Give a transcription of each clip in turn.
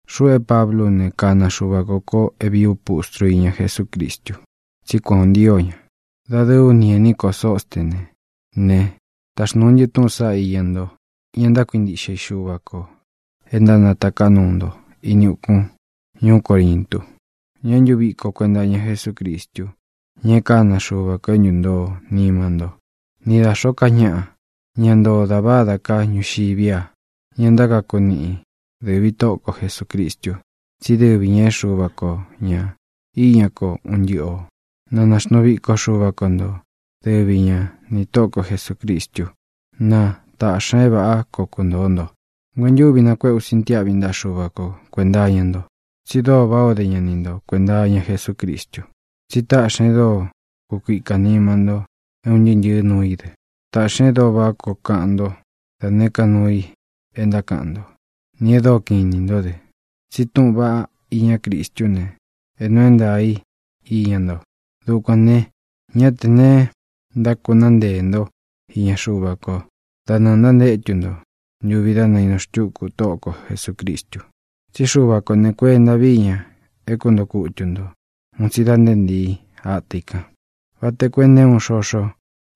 Xuꞌu é Pablú u ne, kana Xuva kō ko é vīí u pustru iña Jesúcristu, tsí kuan ō ntío ña. Dadɨɨ ú ni ēní ko Sostené ne, táxnūu ntɨ́ túꞌūn saꞌá iña nto, ña ntákuintiꞌxe i Xuva kō e ntánatāká nuu nto ini ukun ñuú Corintu, ña é ntuviko kuēnta iña Jesúcristu, ña e kána Xuva kō é ntuntoo nima ntó, ni dā xóo ká ñaꞌa, ña ntoo dá vādá ka ñuxiví a, ña ntákaku niꞌi dɨ̄ví Tóꞌo ko Jesūcristu. Tsí dɨvi ñā é Xuva ko ña iña ko un ntɨ́ꞌɨ ō. Na naxnuu viko Xuva ko nto, dɨvi ña nī Tóꞌo ko Jesūcristu. Na tāꞌxi ña é vāꞌá koo kuntōo nto. Nguentúvi kanakuéꞌe ú sintiáꞌvi ntaꞌa Xuva ko kuēnta iña nto, tsi dóo váꞌā o dé ña ni nto kuēnta iña Jesúcristu. Tsi táꞌxi ña e dóo kukuika níma nto é un ntɨɨ́ ntɨ̄ɨ́ nuu i dɨ. Tāꞌxi ña e dóo váꞌa koo kaꞌan nto da nēé ka nuu i e ntákaꞌan nto, nī e dóo kiꞌin inī ntó dɨ. Tsi túꞌūn vaꞌá iñá Cristú ne, é nuu é ntaā í iña nto. Dukuān ne, ñá tē neé ntákūnáa nteē ntó iña Xuva kó da nɨɨ̄ ntántétu nto ntuvi dá nainu xtúku Tóꞌo ko Jesūcristu. Tsí Xuva kō ne, kuenta vií ña é kuntoo kutu ntō un tsi da nté ntīi ata i kan, vata koo e nté uun xoxo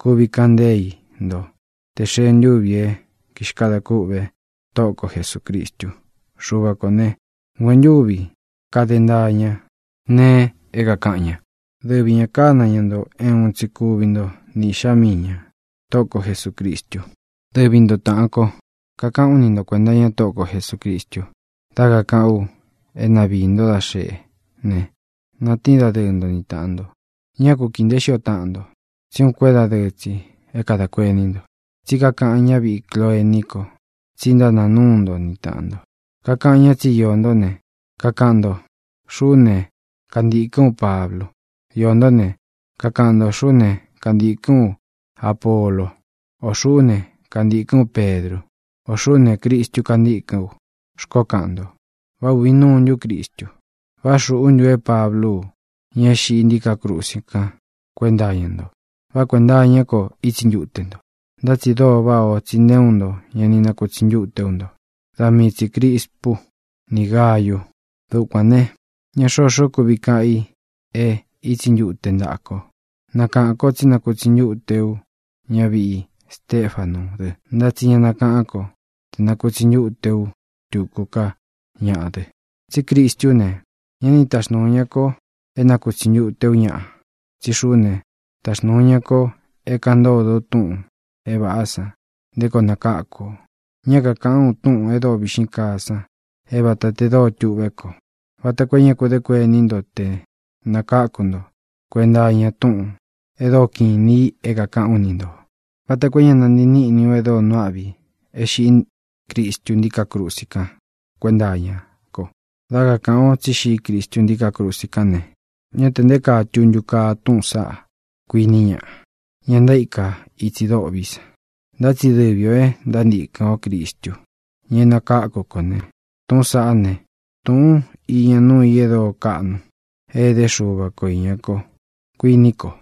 kuvi kaꞌan nteé i nto tē xee ntúvī é kixkadā kûꞌve Tóꞌo ko Jesūcristu. Xuva kō ne, nguentúvi kade ntaa ña nee é kākaꞌan ña. Dɨvi ña kāna ña nto é uun tsi kuvi nto ni Īꞌxá mii ña, Tóꞌo ko Jesūcristu. Dɨvi nto, tāꞌan kó, kakaꞌán u ni nto kuēnta iña Tóꞌo ko Jesūcristu dá kakaꞌán u é na viī ntó da xeꞌé ne, natíin dadɨ́ɨ nto ni tāꞌan nto. Ñá ku kīi nteé xio taꞌan nto, tsí uun kuédadɨɨ tsi é kadā kuení nto. Tsí kakaꞌan ñáviꞌi Cloee ní ko tsi ntánāa núu nto ni tāꞌan nto. Kakaꞌan ñá tsi íō ntó ne, kakaꞌan nto: “Xuꞌú ne, kantīkɨ́n u Pablu”; iō ntó ne, kakaꞌan nto: “Xuꞌú ne, kantīkɨ́n u Apolo”; ō “Xuꞌú ne, kantīkɨ́n u Pedru”; ō “Xuꞌú ne, Cristu kantîkɨ́n u”, xkoó kaꞌan nto. ¿Vá ūvi nuu ntú Cristu? ¿Vá xūꞌú ntu é Pablú u ña é xiꞌí ntiká krusi kan kuénta iña nto? ¿Vá kuenta iñá ko ítsi ntute nto? Ntá tsi dóo váꞌā ó tsi nté uun nto ña ni nakutsi ntúte ú nto; da mii tsī Crispu ni Gáyu. Dukuān ne, ñá xoxó kuvi kaꞌan i e ítsi ntute ntaꞌa ko. Nakaꞌān kó tsí nakutsi ntúte ú ñaviꞌi Stefanú dɨ. Ntá tsi ña nakaꞌán ko tē nakutsi ntúte ú tuku ká ñaꞌa dɨ. Tsí Cristú ne, ñá ni taxnūu ña ko é nakūtsi ntute ú ñaꞌa, tsí xuꞌú ne, taxnūu ña ko é kāꞌan ntódo u túꞌūn é vāꞌá san nté koo nakáku ō. Ñá kakāꞌán u túꞌūn e dóo viꞌxín kaa san é vata tē dóo tuꞌvé ko, vata koo é ña ku dé kuení nto te nākáku nto kuenta iña túꞌūn e dóo kiꞌin inī i é kākaꞌán u ni ntō, vata koo é ña nantii níꞌni u e dóo nuu áꞌvi i é xiꞌí Cristu ntíkā krusi kan kuénta iña ko. Dá kakāꞌan o tsí xiꞌí Cristu ntíkā krusi kán ne, ñá tē nté kaa tuntu kaa túꞌūn saꞌá, kuiní ñaꞌa, ña ntaíka itsi dôꞌví san. Ntá tsi dɨvi ō e ntántīkɨn ó Cristu, ña é nakáku kō ne, tūꞌún sāꞌá ne, tūꞌun íña núu i e dóo kaꞌnu é edé Xuva ko īña ko, kuiní kō.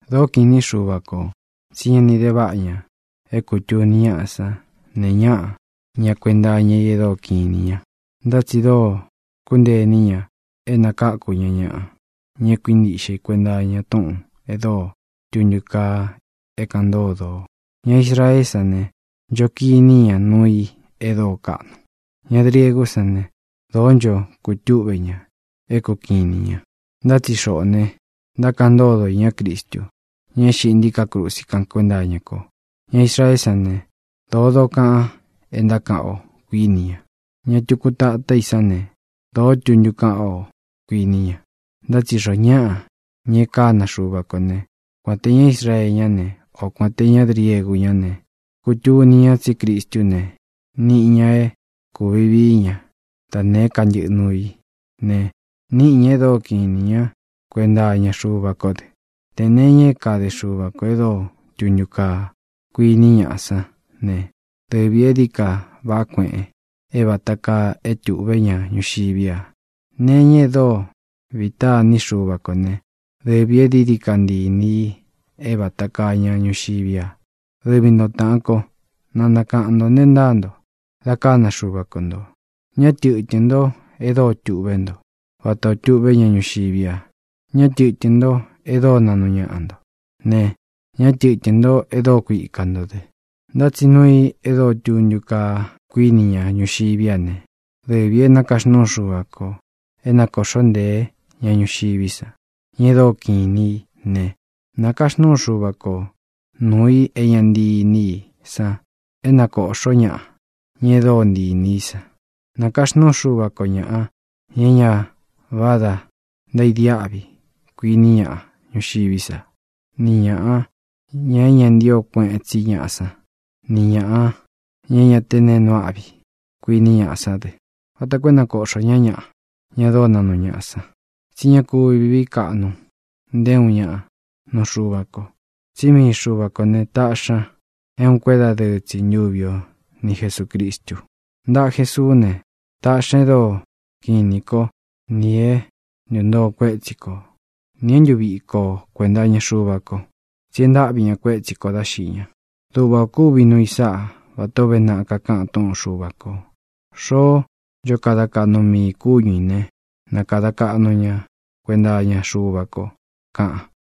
Dōó kiꞌin īni Xúva kō, tsi ñá ni dē vaꞌa ña é kutūni ñáꞌa san nee ñáꞌa ña kuenta iña i e dóo kiꞌin inī ña, ntá tsi dóo xkúntee iní ña é nakakū ñá ñaꞌa, ña é kuintiꞌxe i ña kuenta iña túꞌūn e dóo tuntu kaa é kāꞌan ntódo o. Ña Israeé san ne, ncho kiní ña nuu i e dóo kaꞌnu; ña griegú san ne, dōó ncho kutúꞌve ña, é kukiꞌin inī ña. Ntá tsi xoꞌō ne, ntákaꞌan ntódo o iñá Cristu, ña é xiꞌí ntiká krusi kan kuénta iña ko. Ña Israeé san ne, dōó dokaꞌan é ntákaꞌan o, kuíni ña. Ña tuku tatá i san ne, dōó tuntu kaꞌan o, kuíni ña. Ntá tsi xoo ñáꞌa, ña e kána Xuva kō né, kuān te ña Israee ñá ne, o kuān te ñá griegu ñá ne, kutuni ña tsí Cristú ne, nīꞌi ña é kūvi vií ña da nēé ka ntɨꞌɨ nuu í, ne, niꞌi ña e dóo kiꞌin inī ñá kuenta iña Xuva kó dɨ. Tē nee iña é kade Xuva kō e dóo tuntu kaa, kuíni ñaꞌa sán ne, dɨvī e dií ka váꞌa kuēꞌen é vata kaa é tuꞌvé ña ñuxiví a. Nee iña e dóo vita iní Xuva kō ne, dɨvī e dií ka ntii inī i é vata kaa ña ñuxiví a. Dɨvi nto, tāꞌan kó, na nakaꞌan ntō nte ntáa nto dā kána Xuva ko ntō. Ñá tɨtɨ̄n nto e dóo tuꞌvé nto, vatā o túꞌve ña ñuxiví a. Ñá tɨtɨ̄n nto e dóo naꞌnu ñaꞌa nto ne, ña tɨ́tɨn nto e dóo kuika ntō dɨ. Ntá tsi nuu i e dóo tuntu kaa, kuíni ña ñuxiví a ne, dɨvī é nākaxnúu Xuva kō é nakōꞌxó nteē ñá ñuxiví san, ña e dóo kiꞌin inī í ne, nākaxnúu Xuva ko nūu i é ña ntii iní i san é nakōꞌxó ñaꞌa, ña e dóo ntii inī í san. Nakaxnúu Xuva ko ñāꞌa, ña é ñā váda ntaidiáꞌvi, kuíni ñaꞌa ñuxiví sa, nī ñaꞌa, ña é ña ntío kueꞌen tsí ñaꞌa san, nī ñaꞌa, ña é ña te neé nuu áꞌvi i, kuíni ñaꞌa sán dɨ, vata koo é na nakōꞌxó ña ñaꞌa, ña dóo naꞌnu ñaꞌa san. Tsí ña kúvi vīí kaꞌnu nté uun ñaꞌa nuu Xuva ko. Tsí mii Xuva kō né, tāꞌxi ña é uun kuédadɨɨ tsi ntuvi o ni Jesūcristu. Ntaꞌa Jesuú ne, taꞌxi ña e dóo kiꞌin inī kó nī é ntuntoo kuétsi ko, nī é ntuviko o kuēnta iña Xuva ko, tsi e ntáꞌvi ña kuétsi kō dá xiꞌi ña. Duꞌva ō kúvi nuu i sáꞌa vatā ó uve naꞌa kakaꞌan túꞌun Xuva kō: “Xoó ncho kada kaꞌnu mii ī kúñu ī ne, na kāda kaꞌnu ña kuenta iña Xuva ko”, kaꞌan.